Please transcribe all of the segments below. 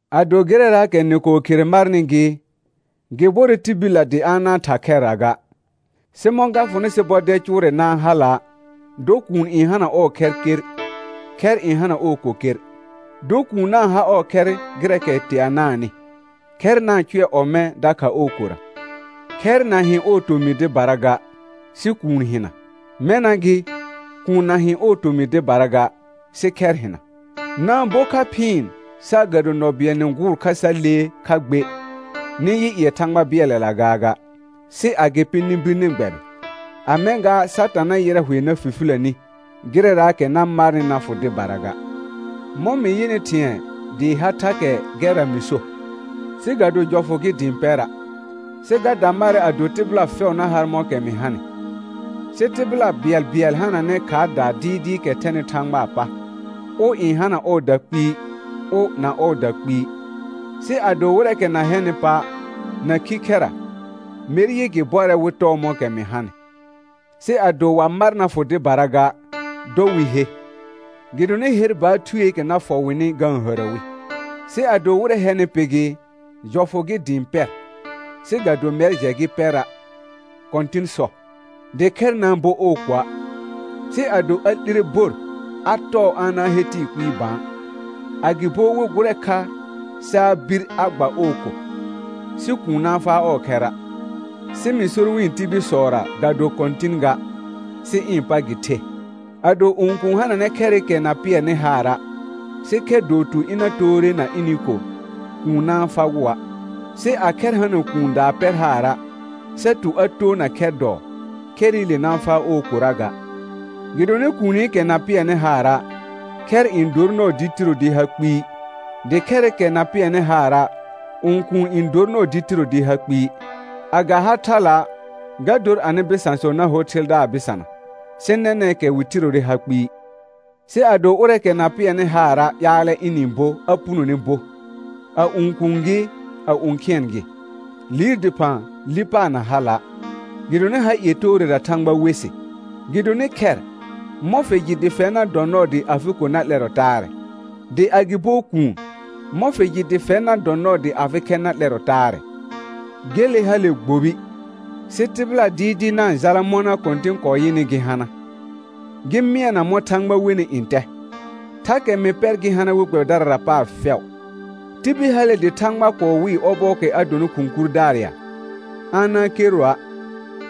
Ado gɩrɛraakɛ nɩ kɔɔ khere marnɩ gɩ, gɩ bɔrɛ tibillə dɩ a na-n tha khɛrra ga. Sɩ mɔ̃ ga fʋnɩ sɩ bɔdɛl cʋʋrɛ na-n hala', dɔ kuun n hana ɔɔ khɛr ker, khɛr n hana ɔɔ ko ker. Dɔ kuun na-n ha ɔɔ khɛr gɩrɛɛkɛ teanaanɩ, khɛr na-n cʋɛ ɔmɛ̃ dakha ɔɔ kora. Khɛr na hɩ̃ ɔɔ tomɩ dɩbara ga, sɩ kuun hɩna; mɛna gɩ, kuun na hɩ̃ ɔɔ tomɩ dɩbara ga, sɩ khɛr hɩna. Na-n bo kha phɩɩn, saagado nɔ bɩɛl nɩ gʋʋr kha sa lee kha gbe, nɩ yɩ ƴɩɛ Thãgba bɩɛlɛla gaaga; sɩ agɩpɩ nɩ bir nɩ gbɛbɩ, a mɛ̃ gaa Satã na yɩrɛ hʋɛ na fifilə ni, gɩrɛraakɛ na marnɩ na fʋ dɩbara ga. Mɔ̃ mɩ yɩnɩ thɩ̃ɛ dɩɩ ha thakɛ gɛrra mɩ so, sɩ ga do jɔfʋ gɩ dɩ ɩ̃ pɛra', sɩ ga da marɛ ado tɩbɩla fɛʋ na har mɔ̃kɛ mɩ hanɩ; sɩ tɩbɩla bɩɛlbɩɛl hananɛ khaardaa dɩɩdɩɩkɛ thɛnɩ Thãgbaa pa, ʋ n hana ɔɔda kpɩɩ, ʋ na ɔɔda kpɩɩ. Sɩ ado wɩrɛɛkɛ na hɛnɩ pa', na khikhɛra, mer yɩ gɩ bɔrɛ wɩ tɔɔ mɔ̃kɛ mɩ hanɩ. Sɩ ado wa mar na fʋ dɩbara ga, dɔ wɩ he, gɩdonɩ her baar thueekɛ na fɔ wɩnɩ ga-n hərə wi. Sɩ ado wɩrɛ hɛnɩ pɩ gɩ, jɔfʋ gɩ dɩ ɩ̃ pɛr, sɩ ga do mɛr jɛ gɩ pɛra', Kɔ̃tɩn sɔ, dɩ khɛr na-n bo ɔɔ koa'. Sɩ ado a 'lire bor, a tɔɔ a na-n he tɩɩ kpɩɩ bã, agɩbo wɩ gʋrɛ kha sa a bir a gba ɔɔ ko; sɩ kuun na-n faa ɔɔ khɛra'. Sɩ mɩ sor wɩ̃ tibilsɔra ga do Kɔ̃tɩn ga, sɩ ɩ̃ pa gɩ the: Ado õkuun hananɛ khɛrɩkɛ na pɩɛrnɩ haara', sɩ khɛr dɔɔ tu ɩna toore na ɩnɩ ko, kuun na-n fagʋa'. Sɩ a khɛr hana kuun daa pɛr haara', sa tu a toona khɛr dɔɔ, khɛrɩle na-n faa ɔɔ kora ga. Gɩdonɩ kuunikɛ na pɩɛrnɩ haara', khɛr n dor nɔɔ dɩ tiro dɩ ha kpɩɩ; dɩ khɛrɩkɛ na pɩɛrnɩ haara', õkuun n dor nɔɔ dɩ tiro dɩ ha kpɩɩ; a ga ha thala', ga dor anɩ bɩsãsɔ na hor thɩldaar bɩsana, sɩ nɛnɛ̃kɛ wɩ tirore ha kpɩɩ. Sɩ ado ʋrɛɛkɛ na pɩɛrnɩ haara' ƴaalɛ ɩnɩ-n bo a punone bo; a õkuun gɩ, a õkhɩɛn gɩ, liir dɩphã li paar na hala', gɩdonɩ ha ie toorera Thãgba we sɩ. Gɩdonɩ khɛr, mɔ̃ fɩ jɩ dɩ fɛr na dɔ nɔɔ dɩ afɩ ko na 'lɛrɔ taarɛ? Dɩ agɩbo kuun, mɔ̃ fɩ jɩ dɩ fɛr na dɔ nɔɔ dɩ afɩ khɛr na 'lɛrɔ taarɛ? Gele hale gbobi, sɩ tɩbɩla dɩɩdɩɩ na-n jala mɔna Kɔ̃tɩn kɔɔ yɩnɩ gɩ hana, gɩ mɩɛna mɔ̃ Thãgba wenɩ ntɛ; thakɛ mɩ pɛr gɩ hana we gbɛbɩdarara paar fɛʋ. Tibil hale dɩ Thãgba kɔɔ wɩɩ ɔbɔɔkɛ a donɩ khʋ̃ kurdaar ya? A na-n kerroa'.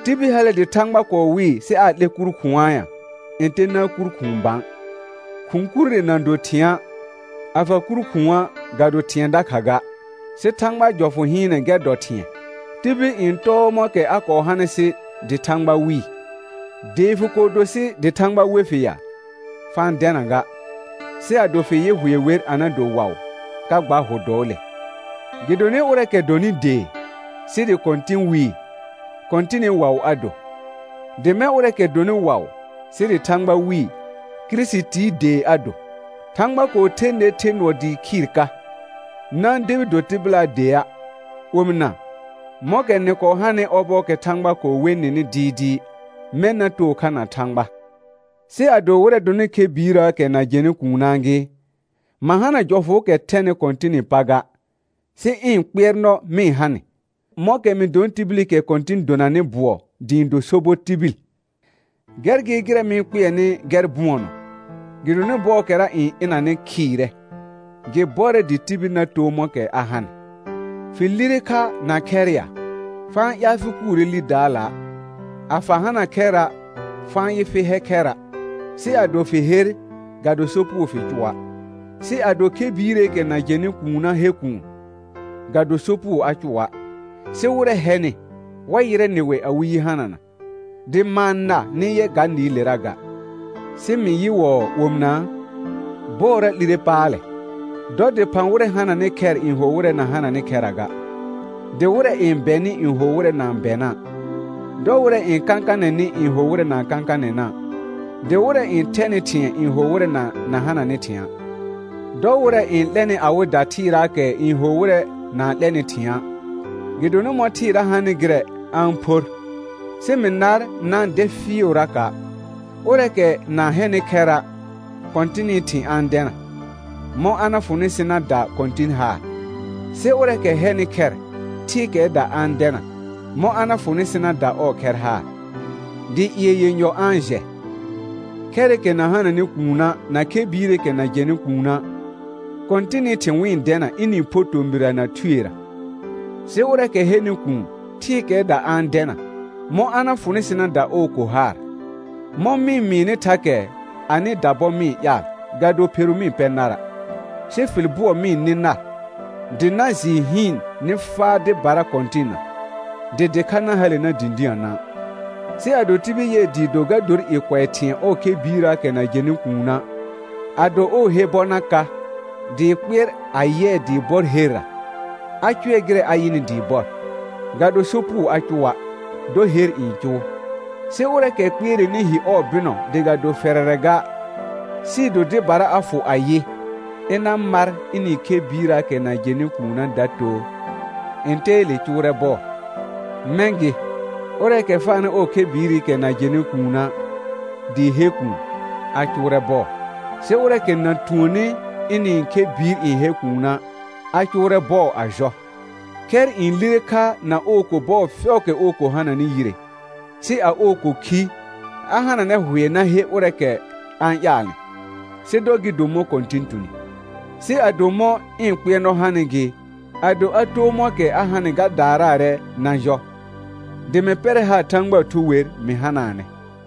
Tibil hale dɩ Thãgba kɔɔ wɩɩ sɩ aa 'lɛ kur khʋ̃a ya? Ntɛ na-n kur khʋ̃ʋ bã. Khʋ̃ kurre na do thɩ̃a', a fa kur khʋ̃a', ga do thɩ̃ɛ dakha ga, sɩ Thãgbaa jɔfʋ hɩɩnɛ gɛr dɔ thɩ̃ɛ. Tibil n tɔɔ mɔ̃kɛ a kɔɔ hanɩ sɩ dɩ Thãgba wɩɩ. Dee fɩ kɔɔ do sɩ dɩ Thãgba we fɩ ya? Fa-n dɛna ga; sɩ ado fɩ yɩ hʋɛ wer a na do waʋ, ka gba hʋ dɔɔle. Gɩdonɩ ʋrɛɛkɛ dɔnɩ dee, sɩ dɩ Kɔ̃tɩn wɩɩ, Kɔ̃tɩnɩ waʋ a do; dɩ mɛ̃ ʋrɛɛkɛ dɔnɩ waʋ, sɩ dɩ Thãgba wɩɩ, Kirisitii dee a do. Thãgba kɔɔ the ner the nʋɔ dɩɩ khɩɩr ka, na-n debi do tɩbɩlaa dea'. Omɩna, mɔ̃kɛ nɩ kɔɔ hanɩ ɔbɔɔkɛ Thãgba kɔɔ we nɩnɩ dɩɩdɩɩ, mɛ̃ na too kha na Thãgba. Sɩ ado wɩrɛ dɔnɩ khɛ biirəəkɛ na jɛnɩ kuunaa gɩ, ma hana jɔfʋʋkɛ thɛnɩ Kɔ̃tɩnɩ pa ga, sɩ ɩ̃ kpɩɛrnɔ mɩ-n ha nɩ, mɔ̃kɛ mɩ donɩ tibilikɛ Kɔ̃tɩn donanɩ bʋɔ dɩ ɩ̃ do sobɔ tibil. Gɛr gɩ gɩrɛ mɩ-n kpɩɛrnɩ gɛr bʋɔnɔ, gɩdonɩ bɔɔkɛra n ɩnanɩ khɩɩrɛ: Gɩ bɔrɛ dɩ tibil na too mɔ̃kɛ a hanɩ. Fɩ lire kha na khɛr ya? Fa-n ƴaal fɩ kuure lidaala'; a fa hana khɛra', fa-n yɩ fɩ hɛ khɛra'. Sɩ ado fɩ her, ga do sopugo fɩ cʋa'; sɩ ado khɛ biireekɛ na jɛnɩ kuuna' he kuun, ga do sopugo a cʋa'. Sɩ wɩrɛ hɛnɩ, wa yɩrɛ nɩwɛ awɩ yi hanana, dɩ ma-n na nɩ yɛ ga nɩɩlera ga. Sɩ mɩ yɩ wɔɔ omɩnaa: Bɔɔra 'lire paalɛ, dɔ dɩphã wɩrɛ hananɩ khɛr n ho wɩrɛ na hananɩ khɛra ga; dɩ wɩrɛ n bɛnɩ n ho wɩrɛ na-n bɛna'; dɔ wɩrɛ n kãkanɛnɩ n ho wɩrɛ na-n kãkanɛna', dɩ wɩrɛ n thɛnɩ thɩ̃ɛ n ho wɩrɛ na hananɩ thɩ̃a'; dɔ wɩrɛ n 'lɛnɩ awɩda thɩɩraakɛ n ho wɩrɛ na-n 'lɛnɩ thɩ̃a'; gɩdonɩ mɔ̃ thɩɩra hanɩ gɩrɛ, a-n phor. Sɩ mɩ nar na-n dɛ fɩɩʋraka'. Ʋrɛɛkɛ na hɛnɩ khɛra', Kɔ̃tɩnɩ thɩ̃ a-n dɛna, mɔ̃ a na fʋnɩ sɩ na da Kɔ̃tɩn haar. Sɩ ʋrɛɛkɛ hɛnɩ khɛr, thɩɩkɛɛda a-n dɛna, mɔ̃ a na fʋnɩ sɩ na da ɔɔ khɛr haar, dɩ ƴɩɛ yenyɔ a-n jɛ. Khɛrɩkɛ na hananɩ kuuna' na khɛ biireekɛ na jɛnɩ kuuna', Kɔ̃tɩnɩ thɩ̃ wɩ-n dɛna ɩnɩ-n pho tomɩrra na thuerə. Sɩ ʋrɛɛkɛ hɛnɩ kuun, thɩɩkɛɛda a-n dɛna, mɔ̃ a na fʋnɩ sɩ na da ɔɔ ko haar. Mɔ̃ mɩ-n mɩɩnɩ thakɛ, anɩda bɔ mɩ-n ƴaal, ga do pheru mɩ-n pɛ nara', sɩ fɩl bʋɔ mɩ-n nɩ nar, dɩ na jɩɩ hɩɩn nɩ faa dɩbara Kɔ̃tɩnna, dɩ dɩkha na hale na dĩdiə na'. Sɩ ado tibil yɩɛ dɩɩ do ga dor i kʋɛ thɩ̃ɛ ɔɔ khɛ biirrəəkɛ na jɛnɩ kuuna', ado ɔɔ he bɔ na ka, dɩ kpɩɛr a yɩɛ dɩɩ bɔr herra, a cʋɛ gɩrɛ a yɩnɩ dɩɩ bɔr, ga do sopugo a cʋa'; dɔ her n cʋʋ. Sɩ ʋrɛɛkɛ kpɩɛrɛnɩ hi ɔɔ bɩnɔ dɩ ga do fɛrɛrɛ ga, sɩɩ do dɩbara a fʋ ayɩ, ɩna mar ɩnɩ khɛ biirrəəkɛ na jɛnɩ kuuna' da too, ntɛɛle cʋʋrɛ bɔɔ. Mɛ̃ gɩ, ʋrɛɛkɛ faanɩ ɔɔ khɛ biirikɛ na jɛnɩ kuuna' dɩ he kuun, a cʋʋrɛ bɔɔ, sɩ ʋrɛɛkɛ na tuonni ɩnɩ khɛ biir n hɛ kuuna', a cʋʋrɛ bɔɔ a jɔ. Khɛr n lire kha na ɔɔ ko bɔɔ fɛʋʋkɛ ɔɔ ko hananɩ yire; sɩ a ɔɔ ko khi, a hananɛ hʋɛ na he ʋrɛɛkɛ a-n ƴaalnɩ, sɩ dɔ gɩ do mɔ̃ Kɔ̃tɩn tuni. Sɩ ado mɔ̃ ɩ̃ kpɩɛrnɔ hanɩ gɩ, ado a too mɔ̃kɛ a hanɩ ga daaraarɛ na jɔ, dɩ mɩ pɛrɛ haar Thãgbaa Thu wer mɩ hanaanɛ.